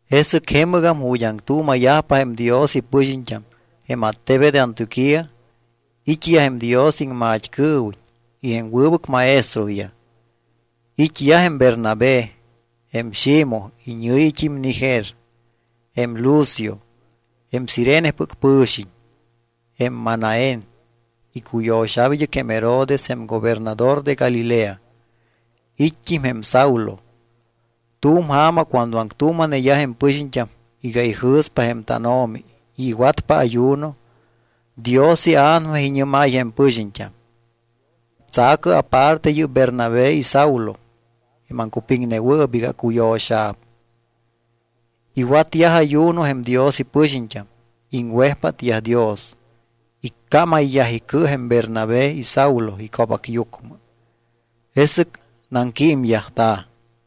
Jesɨc jemɨgam ju̱t́ aŋtuuma̱yajpa jém Dios ipɨxiñt́am, jém attebet Antioquía, it́yaj jém Dios iŋmat́cɨɨwiñ y jém wɨbɨc maestroyaj. It́yaj jém Bernabé; jém Ximoj iñɨ̱yit́im Niger; jém Lucio, jém Cirenepɨc pɨ̱xiñ; jém Manaén, icuyo̱xa̱p id́ɨc jém Herodes jém gobernador de Galilea; it́t́im jém Saulo. Tu̱m ja̱ma cuando aŋtuuma̱neyaj jém pɨxiñt́am iga ijɨ̱spa jém tánO̱mi y iwatyajpa ayuno, Dios iA̱nama iñɨ́máy jém pɨxiñt́am: —Tsa̱cɨ aparte yɨ́p Bernabé y Saulo jém aŋcupiŋnewɨɨp iga acuyo̱xa̱p. Iwatyaj ayuno jém Dios ipɨxiñt́am, iŋwejpátyaj Dios, iccámayyaj icɨ jém Bernabé y Saulo ico̱bacyucmɨ. Jesɨc naŋquímyajta̱.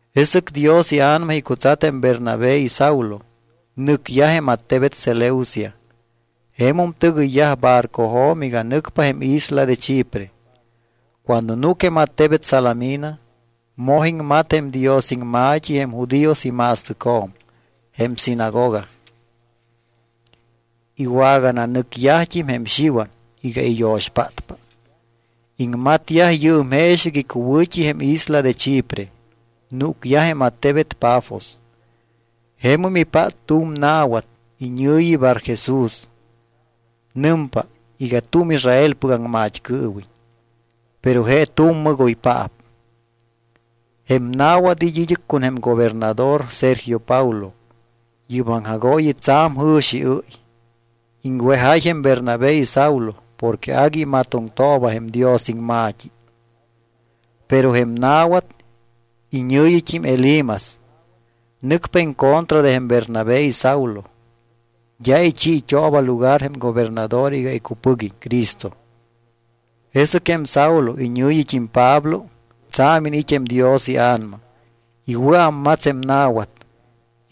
Jesɨc Dios iA̱nama icutsat jém Bernabé y Saulo. Nɨcyaj jém attebet Seleucia. Jemum tɨgɨyyaj barcojo̱m iga nɨcpa jém isla de Chipre. Cuando núc jém attebet Salamina, moj iŋmat jém Dios iŋma̱t́i jém judíos ima̱stɨcjo̱m, jém sinagoga. Iwagananɨcyajt́im jém Xiwan iga iyo̱xpátpa. Iŋmatyaj yɨɨm jeexɨc icuwɨ̱t́i jém isla de Chipre. Núcyaj jém attebet Pafos. Jemum ipát tu̱m na̱wat iñɨ̱yi Barjesús. Nɨmpa iga tu̱m Israelpɨc aŋmat́cɨɨwiñ, pero je tu̱m mɨgoypaap. Jém na̱wat it́ id́ɨc con jém gobernador Sergio Paulo. Yɨ́p aŋjagooyi tsa̱m jɨ̱xiɨ́y. Iŋwejáy jém Bernabé y Saulo porque agui imatoŋtooba jém Dios iŋma̱t́i. Pero jém na̱wat, iñɨ̱yit́im Elimas, nɨcpa en contra de jém Bernabé y Saulo. D́a ichiit́ooba lugar jém gobernador iga icupɨguiñ Cristo. Jesɨc jém Saulo, iñɨ̱yit́im Pablo, tsa̱m iniit́ jém Dios iA̱nama. Iwɨ̱ámmats jém na̱wat.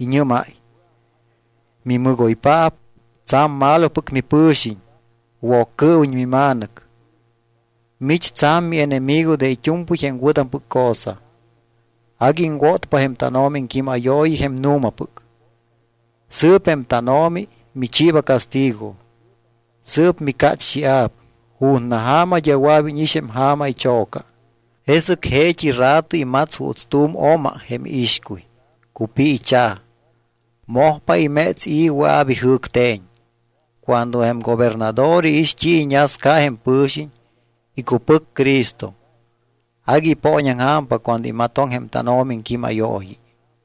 Iñɨ́máy: —Mimɨgoypaap, tsa̱m malopɨc mipɨ̱xiñ, Woccɨɨwiñ mima̱nɨc. Mich tsa̱m mienemigo de it́u̱mpɨy jém wɨ̱tampɨc cosa. Agui iŋwótpa jém tánO̱mi iŋquímayooyi jém nu̱mapɨc. Sɨɨp jém tánO̱mi michiiba castigo. Sɨɨp micácht́ia̱p. Ju̱na ja̱ma d́a wɨa̱p íñix jém ja̱ma icho̱ca. Jesɨc jeet́i rato imats juuts tu̱m oma jém iixcuy, cupiicha̱. Mojpa iméts i̱ wɨa̱p ijɨ̱cte̱ñ. Cuando jém gobernador iix t́i iñasca jém pɨ̱xiñ, icupɨc Cristo. Agui ipooñaŋja̱mpa cuando imatoŋ jém tánO̱mi iŋquímayooyi.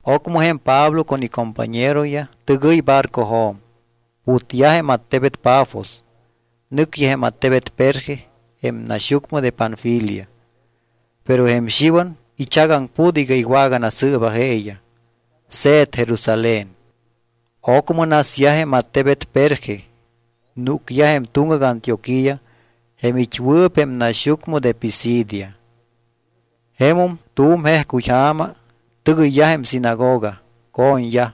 Ocmɨ jém Pablo con icompañeroyaj tɨgɨy barcojo̱m, putyaj jém attebet Pafos. Nɨcyaj jém attebet Perge jém naxyucmɨ de Panfilia. Pero jém Xiwan ichagaŋput iga iwaganasɨɨba jeeyaj, se̱t Jerusalén. Ocmɨ nasyaj jém attebet Perge, núcyaj jém tuŋgac Antioquía jém it́wɨɨp jém naxyucmɨ de Pisidia. Jemum tu̱m jejcuy ja̱ma tɨgɨyyaj jém sinagoga, co̱ñyaj.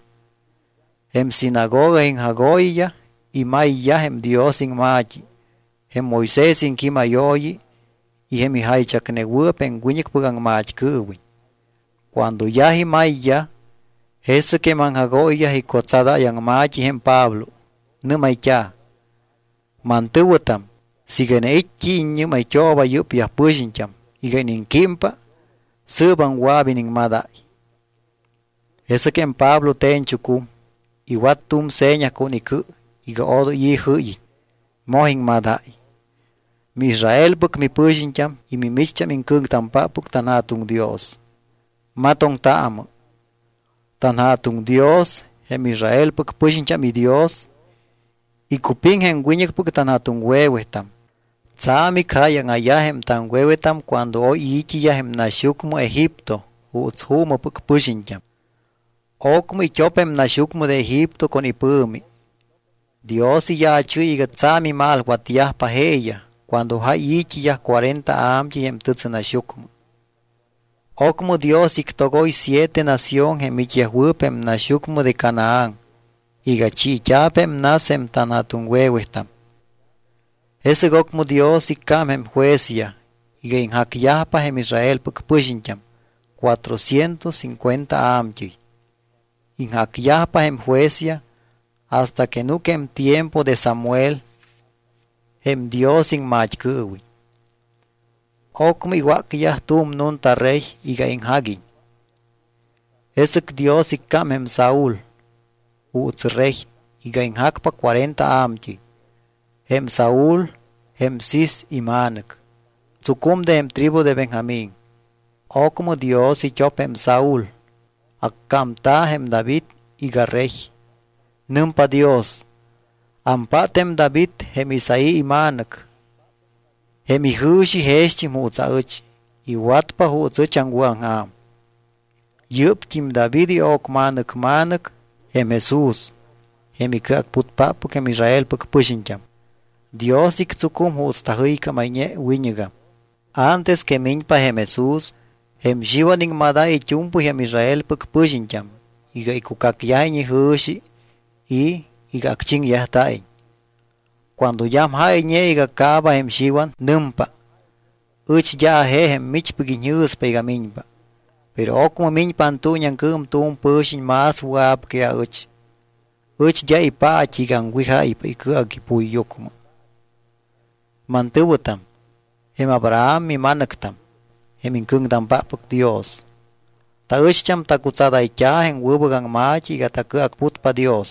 Jém sinagoga iŋjagooyiyaj imayyaj jém Dios iŋma̱t́i, jém Moisés iŋquímayooyi y jém ijaychacnewɨɨp jém wiñɨcpɨc aŋmat́cɨɨwiñ. Cuando yaj imayyaj, jesɨc jém aŋjagooyiyaj icutsadáy aŋma̱t́i jém Pablo. Nɨ́mayt́a̱: —Mantɨ̱wɨtam, siiga iniit́ t́i iññɨ́mayt́ooba yɨ́pyaj pɨxiñt́am iga iniŋquímpa, sɨɨbam wɨa̱p iniŋmadáy. Jesɨc jém Pablo te̱ñchucum. Iwat tu̱m seña con icɨ iga odoy i̱ jɨ́yiñ, moj iŋmadáy: —MiIsraelpɨc mipɨxiñt́am y mimicht́am iŋcɨ̱ŋtampáppɨc tanJa̱tuŋ Dios, matoŋtaamɨ. TanJa̱tuŋ Dios, jém Israelpɨc pɨxiñt́am iDios, icupiŋ jém wiñɨcpɨc tanja̱tuŋwe̱wetam. Tsa̱m icjáyaŋa̱yaj jém taŋwe̱wetam cuando oy i̱t́iyaj jém naxyucmɨ Egipto juuts juumɨpɨc pɨxiñt́am. Ocmɨ it́op jém naxyucmɨ de Egipto con ipɨ̱mi. Dios iyaachɨ́y iga tsa̱m imalwatyajpa jeeyaj cuando jáy i̱t́iyaj cuarenta a̱mt́ɨy jém tɨtsɨnaxyucmɨ. Ocmɨ Dios ictogoy siete nación jém it́yajwɨɨp jém naxyucmɨ de Canaán iga chiit́a̱p jém nas jém tanja̱tuŋwe̱wetam. Jesɨc ocmɨ Dios iccám jém juezyaj iga iŋjacyajpa jém Israelpɨc pɨxiñt́am cuatrocientos cincuenta a̱mt́ɨy. Iŋjacyajpa jém juezyaj hasta que núc jém tiempo de Samuel jém Dios iŋmat́cɨɨwiñ. Ocmɨ iwácyaj tu̱m nunta rey iga iŋjaguiñ. Jesɨc Dios iccám jém Saúl juuts rey iga iŋjacpa cuarenta a̱mt́ɨy. Jém Saúl, jém Cis ima̱nɨc, tsucum de jém tribu de Benjamín. Ocmɨ Dios it́op jém Saúl. Accámta̱ jém David iga rey. Nɨmpa Dios: “Ampát jém David jém Isaí ima̱nɨc. Jém ijɨ̱xi jext́im juuts aɨch. Iwatpa juuts ɨch aŋwɨ̱aŋja̱m.” Yɨ́pt́im David io̱cma̱nɨc ma̱nɨc jém Jesús, jém icɨacputpáppɨc jém Israelpɨc pɨxiñt́am. Dios ictsucum juuts tajɨycámayñe wiñɨgam. Antes que miñpa jém Jesús, jém Xiwan iŋmadáy it́u̱mpɨy jém Israelpɨc pɨxiñt́am iga icucacyajiñ ijɨ̱xi y iga acchiŋyajta̱iñ. Cuando d́am jáyñe iga caaba jém Xiwan, nɨmpa: “Ɨch d́a aje jém michpɨc iñjɨ̱spa iga miñpa. Pero ocmɨ miñpa antuuñiaŋcɨɨm tu̱m pɨ̱xiñ más wɨa̱p que aɨch. Ɨch d́a ipa̱t́i iga aŋwijáypa icɨac ipuyyucmɨ.” ’Mantɨ̱wɨtam, jém Abraham mima̱nɨctam, jém iŋcɨ̱ŋtampáppɨc Dios, taɨcht́am tacutsadayt́a̱ jém wɨbɨc aŋma̱t́i iga tacɨacputpa Dios.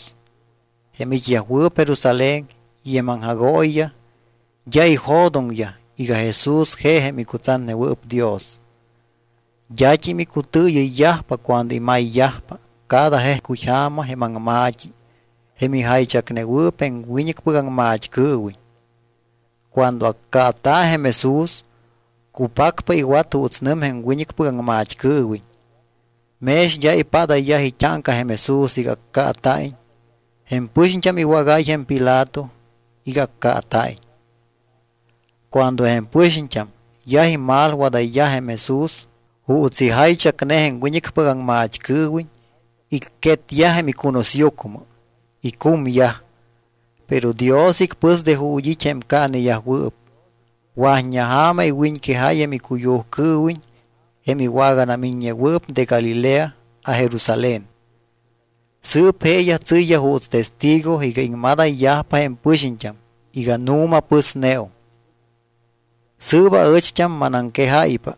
Jém it́yajwɨɨp Jerusalén y jém iŋjagooyiyaj d́a ijo̱doŋyaj iga Jesús je jém icutsatnewɨɨp Dios. D́at́im icutɨɨyɨyyajpa cuando imayyajpa cada jejcuy ja̱ma jém aŋma̱t́i jém ijaychacnewɨɨp jém wiñɨcpɨc aŋmat́cɨɨwiñ. Cuando accaata̱ jém Jesús, cupacpa iwat juuts nɨm jém wiñɨcpɨc aŋmat́cɨɨwiñ. Mex d́a ipádayyaj it́áŋca jém Jesús iga accaata̱iñ, jém pɨxiñt́am iwágáy jém Pilato iga accaata̱iñ. Cuando jém pɨxiñt́am yaj imalwadayyaj jém Jesús juuts ijaychacne jém wiñɨcpɨc aŋmat́cɨɨwiñ, icquetyaj jém icunusyucmɨ, icumyaj. Pero Dios icpɨs de ju̱t́ it́ jém caaneyajwɨɨp. Wa̱t́ña ja̱ma iwiñquejáy jém icuyujcɨɨwiñ jém iwaganamiññewɨɨp de Galilea a Jerusalén. Sɨɨp jeeyaj tsɨ́yyaj juuts testigo iga iŋmadayyajpa jém pɨxiñt́am iga nu̱ma pɨsneum. ’Sɨɨp aɨcht́am manaŋquejáypa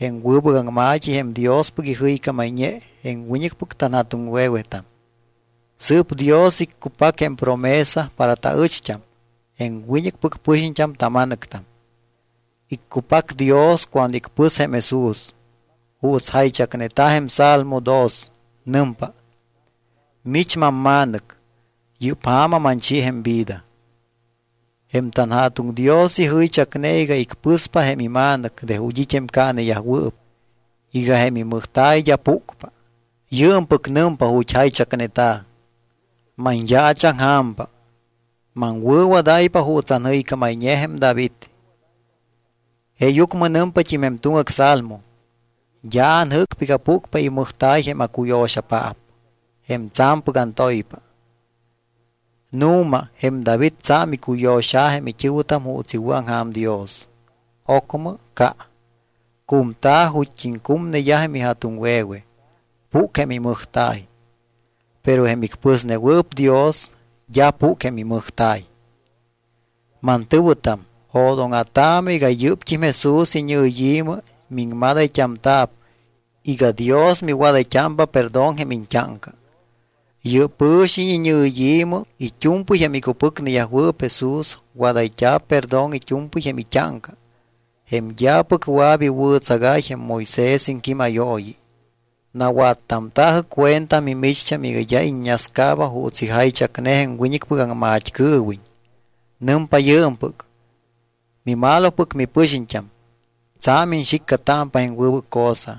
jém wɨbɨc aŋma̱t́i jém Diospɨc ijɨycámayñe jém wiñɨcpɨc tanja̱tuŋwe̱wetam. Sɨɨp Dios iccupac jém promesa para taɨcht́am jém wiñɨcpɨc pɨxiñt́am tama̱nɨctam. Iccupac Dios cuando icpɨs jém Jesús, juuts jaychacneta̱ jém salmo dos. Nɨmpa: Mich mamma̱nɨc. Yɨ́p ja̱ma manchi jém vida. Jém tanJa̱tuŋ Dios ijɨychacne iga icpɨspa jém ima̱nɨc de ju̱t́ it́ jém caaneyajwɨɨp iga jém imɨjta̱y d́a púcpa. Yɨɨmpɨc nɨmpa ju̱t́ jaychacneta̱: Manyaachaŋja̱mpa, maŋwɨ̱wadáypa juuts anjɨycámayñe jém David. Jeeyucmɨ nɨmpat́im jém tuŋgac salmo: D́a anjɨ́cpa iga púcpa imɨjta̱y jém acuyo̱xapaap, jém tsa̱mpɨc antoypa. Nu̱ma jém David tsa̱m icuyo̱xa̱ jém it́ɨ̱wɨtam juuts iwɨ̱aŋja̱m Dios. Ocmɨ ca, cumta̱ ju̱t́t́im cumneyaj jém ija̱tuŋwe̱we, púc jém imɨjta̱y. Pero jém icpɨsnewɨɨp Dios, d́a púc jém imɨjta̱y. Mantɨ̱wɨtam, jo̱dóŋa̱taamɨ iga yɨ́pt́im Jesús iñɨyi̱mɨ miŋmadayt́amta̱p iga Dios miwadayt́ámpa perdón jém iñt́áŋca. Yɨ́p pɨ̱xiñ iñɨyi̱mɨ it́u̱mpɨy jém icupɨcneyajwɨɨp Jesús wadayt́a̱p perdón it́u̱mpɨy jém it́áŋca jém d́apɨc wɨa̱p iwɨ̱tsagáy jém Moisés iŋquímayooyi. Nawattamta̱jɨ cuenta mimicht́am iga d́a iññascaaba juuts ijaychacne jém wiñɨcpɨc aŋmat́cɨɨwiñ. Nɨmpa yɨɨmpɨc: Mimalopɨc mipɨxiñt́am, tsa̱m iñxiccatámpa jém wɨbɨc cosa.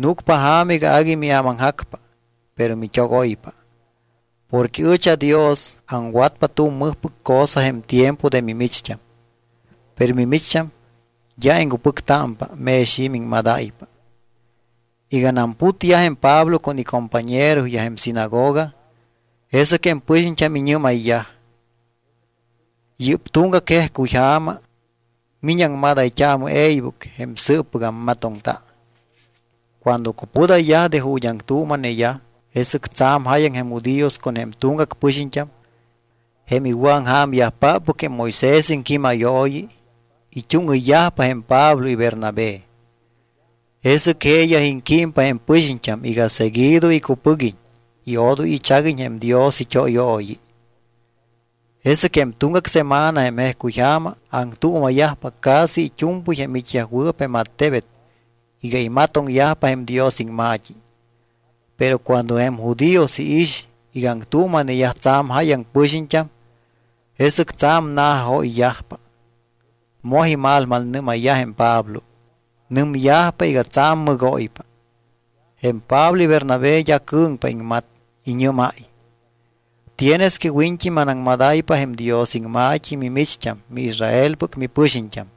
Núcpa ja̱ma iga agui miámaŋjacpa, pero mit́ogoypa. Porque ɨch aDios aŋwatpa tu̱m mɨjpɨc cosa jém tiempo de mimicht́am. Pero mimicht́am d́a iŋcupɨctámpa mex i̱ miŋmadáypa. Iganam putyaj jém Pablo con icompañeroyaj jém sinagoga, jesɨc jém pɨxiñt́am iñɨ́mayyaj: —Yɨ́p tuŋgac jejcuy ja̱ma mi̱ñɨ aŋmadayt́aamɨ e̱ybɨc jém sɨɨppɨc ammatoŋta. Cuando cupudayyaj de ju̱t́ aŋtuuma̱neyaj, jesɨc tsa̱m jáyaŋ jém judíos con jém tuŋgac pɨxiñt́am, jém iwɨ̱aŋja̱myajpáppɨc jém Moisés iŋquímayooyi, it́úŋɨyyajpa jém Pablo y Bernabé. Jesɨc jeeyaj iŋquímpa jém pɨxiñt́am iga seguido icupɨguiñ y odoy ichaguiñ jém Dios it́óyooyi. Jesɨc jém tuŋgac semana jém jejcuy ja̱ma aŋtuuma̱yajpa casi it́u̱mpɨy jém it́yajwɨɨp jém attebet iga imatoŋyajpa jém Dios iŋma̱t́i. Pero cuando jém judíos iix iga aŋtuuma̱neyaj tsa̱m jáyaŋ pɨxiñt́am, jesɨc tsa̱m na̱jajoyyajpa, moj imalmalnɨ́mayyaj jém Pablo. Nɨmyajpa iga tsa̱m mɨgóypa. Jém Pablo y Bernabé d́a cɨ̱ŋpa iŋmat. Iñɨ́máy: —Tienes que wiñt́i manaŋmadáypa jém Dios iŋma̱t́i mimicht́am miIsraelpɨc mipɨxiñt́am.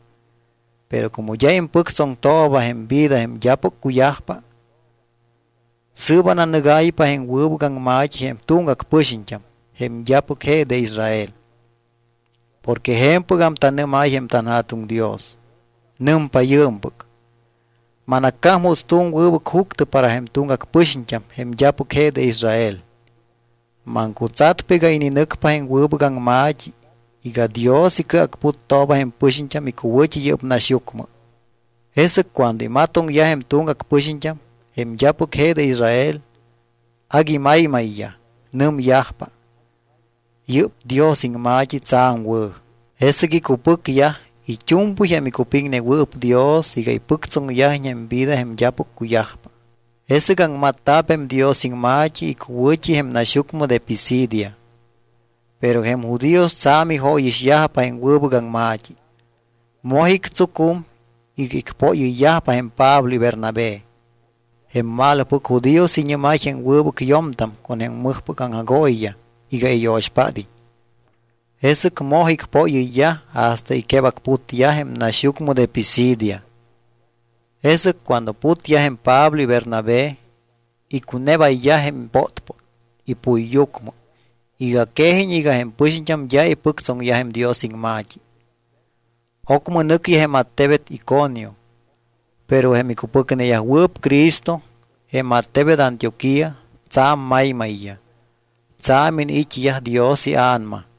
Pero como d́a impɨctsoŋtooba jém vida jém d́apɨc cuyajpa, sɨɨp ananɨgáypa jém wɨbɨc aŋma̱t́i jém tuŋgac pɨxiñt́am jém d́apɨc je de Israel. Porque je̱mpɨgam tanɨ́máy jém tanJa̱tuŋ Dios. Nɨmpa yɨɨmpɨc: Manaccám juuts tu̱m wɨbɨc juctɨ para jém tuŋgac pɨxiñt́am jém d́apɨc je de Israel. Maŋcutsatpa iga ininɨcpa jém wɨbɨc aŋma̱t́i iga Dios icɨacputtooba jém pɨxiñt́am icuwɨ̱t́i yɨ́p naxyucmɨ. Jesɨc cuando imatoŋyaj jém tuŋgac pɨxiñt́am, jém d́apɨc je de Israel, agui maymayyaj. Nɨmyajpa: —¡Yɨ́p Dios iŋma̱t́i tsa̱m wɨ̱! Jesɨc icupɨcyaj it́u̱mpɨy jém icupiŋnewɨɨp Dios iga ipɨctsoŋyajiñ jém vida jém d́apɨc cuyajpa. Jesɨc aŋmatta̱p jém Dios iŋma̱t́i icuwɨ̱t́i jém naxyucmɨ de Pisidia. Pero jém judíos tsa̱m ijóyixyajpa jém wɨbɨc aŋma̱t́i. Moj ictsucum iga icpóyɨyyajpa jém Pablo y Bernabé. Jém malopɨc judíos iñɨ́máy jém wɨbɨc yo̱mtam con jém mɨjpɨc aŋjagooyiyaj iga iyo̱xpád́iñ. Jesɨc moj icpóyɨyyaj hasta icquebacputyaj jém naxyucmɨ de Pisidia. Jesɨc cuando putyaj jém Pablo y Bernabé, icunebayyaj jém pótpót ipuyyucmɨ iga quejiñ iga jém pɨxiñt́am d́a ipɨctsoŋyaj jém Dios iŋma̱t́i. Ocmɨ nɨcyaj jém attebet Iconio. Pero jém icupɨcneyajwɨɨp Cristo jém attebet Antioquía tsa̱m maymayyaj. Tsa̱m iniit́yaj Dios iA̱nama.